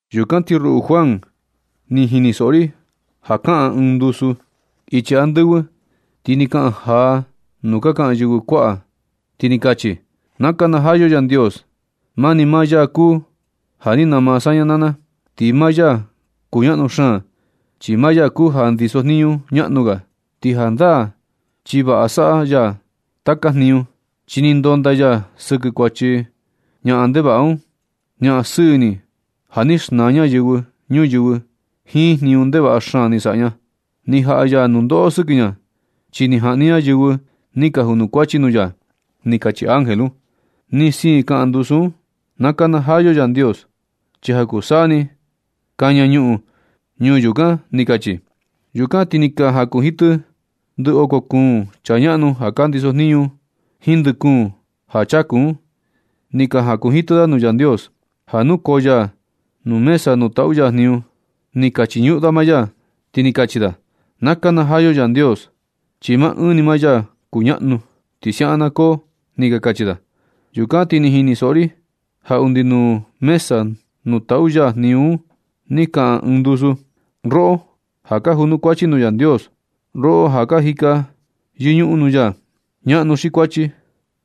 Yukan ti ruꞌu Juan, ni jinisoꞌo ri ja kaꞌan ɨɨn ndusu ichi andɨvɨ, ti ni kaꞌan jaa nuu ka kaꞌan yɨvɨ kuaꞌa, ti ni kachi: ¡Na nakanajaa yo Yandios! Maa ni maa ya kuu ja ni nama saña naa na. Ti maa ya kuñaꞌnu xaan, chi maa ya kuu ja ndisojniñu ñaꞌnu ga. Ti jandaa chi vaꞌa saꞌa ya taka jniñu, chi ni ndonda ya sɨkɨ kuachi ñaꞌan ndevaꞌa un, ñaꞌan sɨɨ ini ja ni xnaa ña yɨvɨ ñuyɨvɨ jiin jniñu ndevaꞌa xaan ni saꞌa ña. Ni jaꞌa ya nundoꞌo sɨkɨ ña, chi ni jaꞌni ña yɨvɨ ni ka junukuachi nuu ya. Ni kachi ángel un. Ti ni siin kaꞌan ndusu un: ―¡Na nakanajaa yo Yandios! Chi ja kuu saa ni kaña ñuꞌun ñuu yukan ―ni kachi. Yukan ti ni ka jakunjitɨ ndɨ oko kuun chaa ñaꞌnu ja ka ndisojniñu, jiin ndɨ kuun ja chaku un. Ni ka jakunjitɨ da nuu Yandios, ja nukoo ya nuu mesa nuu taꞌu ya jniñu. Ni ka chiñuꞌun da maa ya, ti ni kachi da: ―¡Na nakanajaa yo Yandios! ¡Chi maa ɨɨn ni maa ya kuñaꞌnu! Ti siaꞌan na koo ―ni ka kachi da. Yukan ti ni jinisoꞌo ri ja undi nuu mesa nuu taꞌu ya jniñu un ni kaꞌan ɨɨn ndusu: Roꞌo ja ka junukuachi nuu Yandios, roꞌo ja ka jika yɨñuꞌun nuu ya, ñaꞌnu xi kuachi,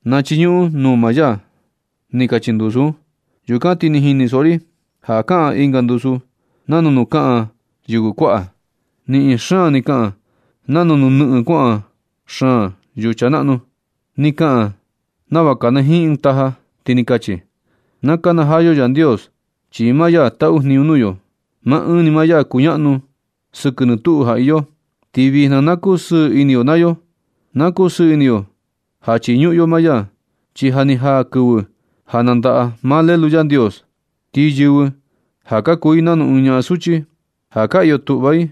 na chiñuꞌun nuu maa ya. Ni kachi ndusu un. Yukan ti ni jinisoꞌo ri ja kaꞌan ɨnga ndusu nanu nuu ka kaꞌan yɨvɨ kuaꞌa. Niꞌin xaan ni kaꞌan nanu nuu nɨꞌɨn kuaꞌa xaan yucha naꞌnu. Ni kaꞌan nava kanajiin ɨɨn taja, ti ni kachi: ¡Na nakanajaa yo Yandios! Chi maa ya taꞌu jniñu nuu yo. Maa ɨɨn ni maa ya kuñaꞌnu sɨkɨ nɨ tuꞌu ja iyo. Ti vijna na kusɨɨ ini yo naa yo. Na kusɨɨ ini yo ja chiñuꞌun yo maa ya. Chi ja ni jaa kɨvɨ ja nandaꞌa maa Lelu Yandios. Ti yɨvɨ ja ka kuu i nanu ɨɨn ñaꞌan suchi, ja ka iyo tuꞌva i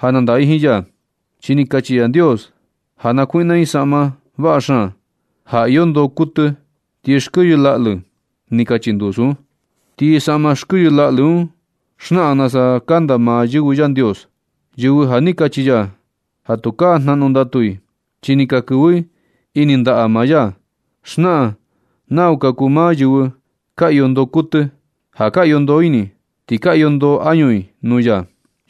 ja nandaꞌa i jiin ya. Chi ni kachi Yandios ja nakuiꞌna i ɨɨn saꞌma vaꞌa xaan, ja iyo ndoo kuɨtɨ ti xkɨyɨ laꞌlɨ. Ni kachi ndusu un. Ti saꞌma xkɨyɨ laꞌlɨ un xnaꞌan nasa kanda maa yɨvɨ Yandios, yɨvɨ ja ni kachi ya ja tukaa jnaꞌnu ndatu i, chi ni ka kɨvɨ i ini ndaꞌa maa ya. Xnaꞌan nau ka kuu maa yɨvɨ ka iyo ndoo kuɨtɨ, ja ka iyo ndoo ini i, ti ka iyo ndoo añu i nuu ya.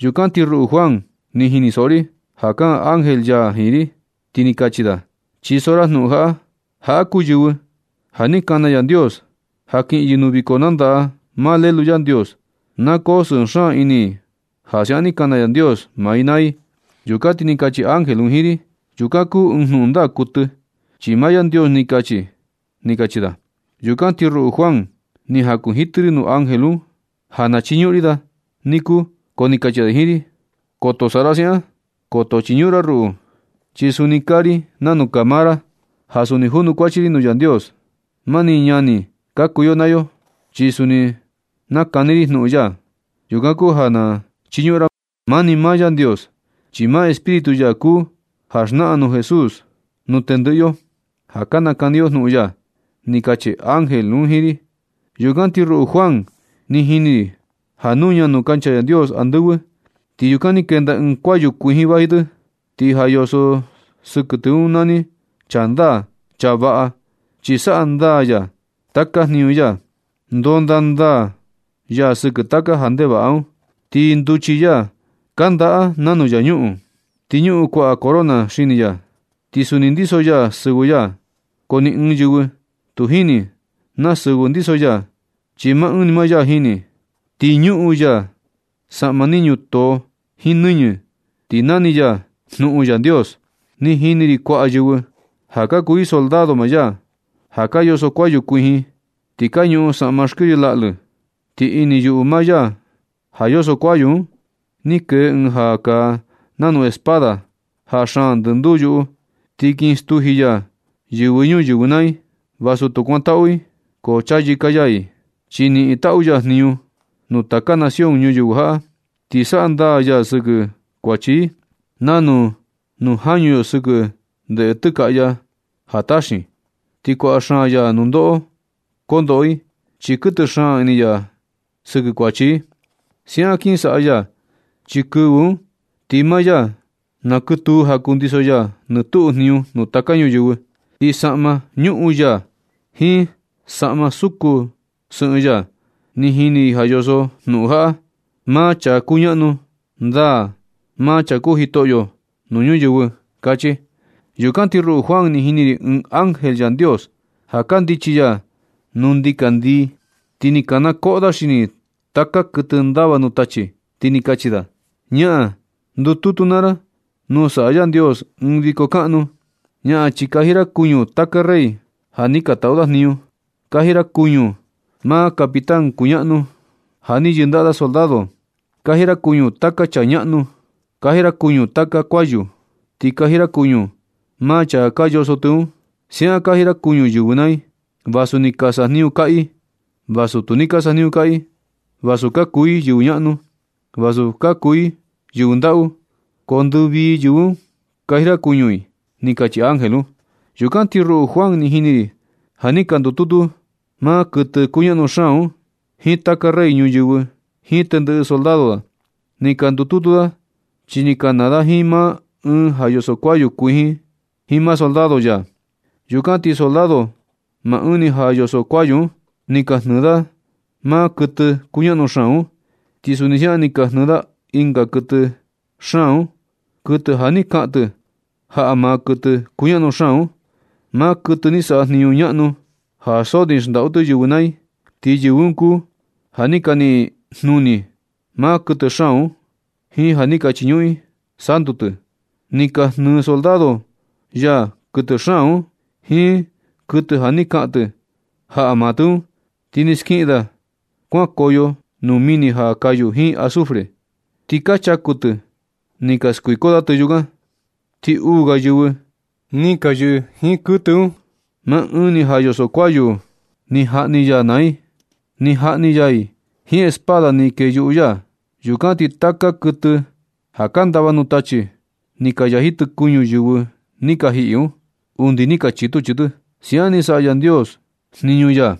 Yukan ti ruꞌu Juan, ni jinisoꞌo ri ja kaꞌan ángel ya jiin ri, ti ni kachi da: ―Chiso ra jnuꞌun jaꞌa: “Jaꞌa kuu yɨvɨ ja ni kana Yandios ja kiꞌin yɨ nuu viko nandaꞌa maa Lelu Yandios. Na koo sɨɨ xaan ini i ja siaꞌan ni kana Yandios maa i naa i.” Yukan ti ni kachi ángel un jiin ri: ―Yukan kuu ɨɨn jnuꞌun ndaa kuɨtɨ, chi maa Yandios ni kachi ―ni kachi da. Yukan ti ruꞌu Juan, ni jakunjitɨ ri nuu ángel un ja na chiñuꞌun ri da niku. Ko ni kachi da jiin ri: ―Koto saꞌa ra siaꞌan. Koto chiñuꞌun ra ruꞌu, chi suni kaa ri nanu kaa maa ra. Ja suni junukuachi ri nuu Yandios. Mani ñani ka kuu yo naa yo, chi suni nakani ri jnuꞌun ya. Yukan kuu ja na chiñuꞌun ra maa ni maa Yandios. Chi maa Espíritu ya kuu ja xnaꞌan jnuꞌun Jesús nuu tendɨꞌɨ yo ja ka nakani yo jnuꞌun ya ―ni kachi ángel un jiin ri. Yukan ti ruꞌu Juan, ni jini ri ja nuña nuu kancha Yandios andɨvɨ. Ti yukan ni kenda ɨɨn kuayu kuijin vaji tɨ. Ti ja yoso sɨkɨ tɨ un nani Chaa Ndaa, Chaa vaꞌa. Chi saꞌa ndaa ya taka jniñu ya. Ndonda ndaa ya sɨkɨ taka ja ndevaꞌa un. Ti nduchi ya kandaꞌa nanu yañuꞌun. Ti ñuꞌun kuaꞌa corona xini ya. Ti suni ndiso ya sɨvɨ ya, ko ni ɨɨn yɨvɨ tu jini na sɨvɨ ndiso ya, chi maa ɨɨn ni maa ya jini. Ti ñuꞌun ya saꞌma ni ñutoo jiin nɨñɨ, ti nani ya Jnuꞌun Yandios. Ni jini ri kuaꞌa yɨvɨ ja ka kuu i soldado maa ya, ja ka yoso kuayu kuijin ti ka ñuꞌun saꞌma xkɨyɨ laꞌlɨ. Ti ini yuꞌu maa ya ja yoso kuayu un ni kee ɨɨn ja kaa nanu espada ja xaan ndɨnduu yuꞌu, ti kin stuji ya yɨvɨ ñuyɨvɨ naa i. Vasu tu kuantaꞌu i, ko chayɨka ya i, chi niꞌin taꞌu ya jniñu nuu taka nación ñuyɨvɨ jaꞌa. Ti saꞌa ndaa ya sɨkɨ kuachi i nanu nuu jañu yo sɨkɨ ndeꞌe tɨkaꞌya ja taxin. Ti kuaꞌa xaan ya nundoꞌo kondoꞌo i, chi kuɨtɨ xaan ini ya sɨkɨ kuachi i. Siaꞌan kin saꞌa ya chi kɨvɨ un ti maa ya nakɨtuu ja kundiso ya nɨ tuꞌu jniñu nuu taka ñuyɨvɨ. Ti saꞌma nuꞌun ya jiin saꞌma suku sɨꞌɨn ya, ni jini ri ja yoso jnuꞌun jaꞌa: “Maa Chaa Kuñaꞌnu Ndaa, Maa Chaa Kuu Jitoꞌyo Nuu Ñuyɨvɨ”, kachi. Yukan ti ruꞌu Juan, ni jini ri ɨɨn ángel Yandios ja kundichi ya nuu ndikandii, ti ni kanakoꞌo da xini taka kuɨtɨ ndava nuu tachi, ti ni kachi da: ―¡Ñaꞌan! Ndututu naa ra nuu saꞌa Yandios ɨɨn viko kaꞌnu. Ñaꞌan, chi kaji ra kuñu taka rey ja ni ka taꞌu da jniñu. Kaji ra kuña maa capitán kuñaꞌnu ja ni yɨndaꞌa soldado. Kaji ra kuñu taka chaa ñaꞌnu. Kaji ra kuñu taka kuayu. Ti kaji ra kuñu maa chaa ka yoso tɨ un. Siaꞌan kaji ra kuñu yɨvɨ naa i, vasu ni ka sajniñu kaꞌa i, vasu tu ni ka sajniñu kaꞌa i, vasu ka kuu i yɨvɨ ñaꞌnu, vasu ka kuu i yɨvɨ ndaꞌu. Ko ndɨvii yɨvɨ un kaji ra kuñu i ―ni kachi ángel un. Yukan ti ruꞌu Juan, ni jini ri ja ni ka ndututu maa kuɨtɨ kuñaꞌnu xaan un jiin taka rey ñuyɨvɨ jiin tendɨꞌɨ soldado da. Ni ka ndututu da, chi kin kanaa da jiin maa Ɨɨn ja yoso kuayu kuijin un jiin maa soldado ya. Yukan ti soldado maa Ɨɨn ja yoso kuayu un, ni ka jnɨɨ da maa kuɨtɨ kuñaꞌnu xaan un. Ti suni siaꞌan ni ka jnɨɨ da ɨnga kuɨtɨ xaan un, kuɨtɨ ja ni kaꞌan tɨ jaꞌa maa kuɨtɨ kuñaꞌnu xaan un, maa kuɨtɨ ni saꞌa jniñu ñaꞌnu ja so ni xndaꞌu tɨ yɨvɨ naa i. Ti yɨvɨ un kuu ja ni ka niꞌin i jnuni maa kuɨtɨ xaan un jiin ja ni ka chiñuꞌun i santu tɨ. Ni ka jnɨ soldado ya kuɨtɨ xaan un jiin kuɨtɨ ja ni kaꞌan tɨ jaꞌa maa tɨ un, ti ni skiꞌin da kuankoyo nuu mini ja kayu jiin azufre. Ti ka chaku tɨ ni ka skuiko da tɨ yukan. Ti uu ga yɨvɨ ni ka yɨꞌɨ jiin kuɨtɨ un, maa Ɨɨn ya yoso kuayu un ni jaꞌni ya i naa i. Ni jaꞌni ya i jiin espada ni kee yuꞌu ya. Yukan ti taka kuɨtɨ ja ka ndava nuu tachi, ni ka yaji tɨ kuñu yɨvɨ ni ka jiꞌi un, undi ni ka chitu chii tɨ. Siukan ni saꞌa ndaa Yandios jniñu ya.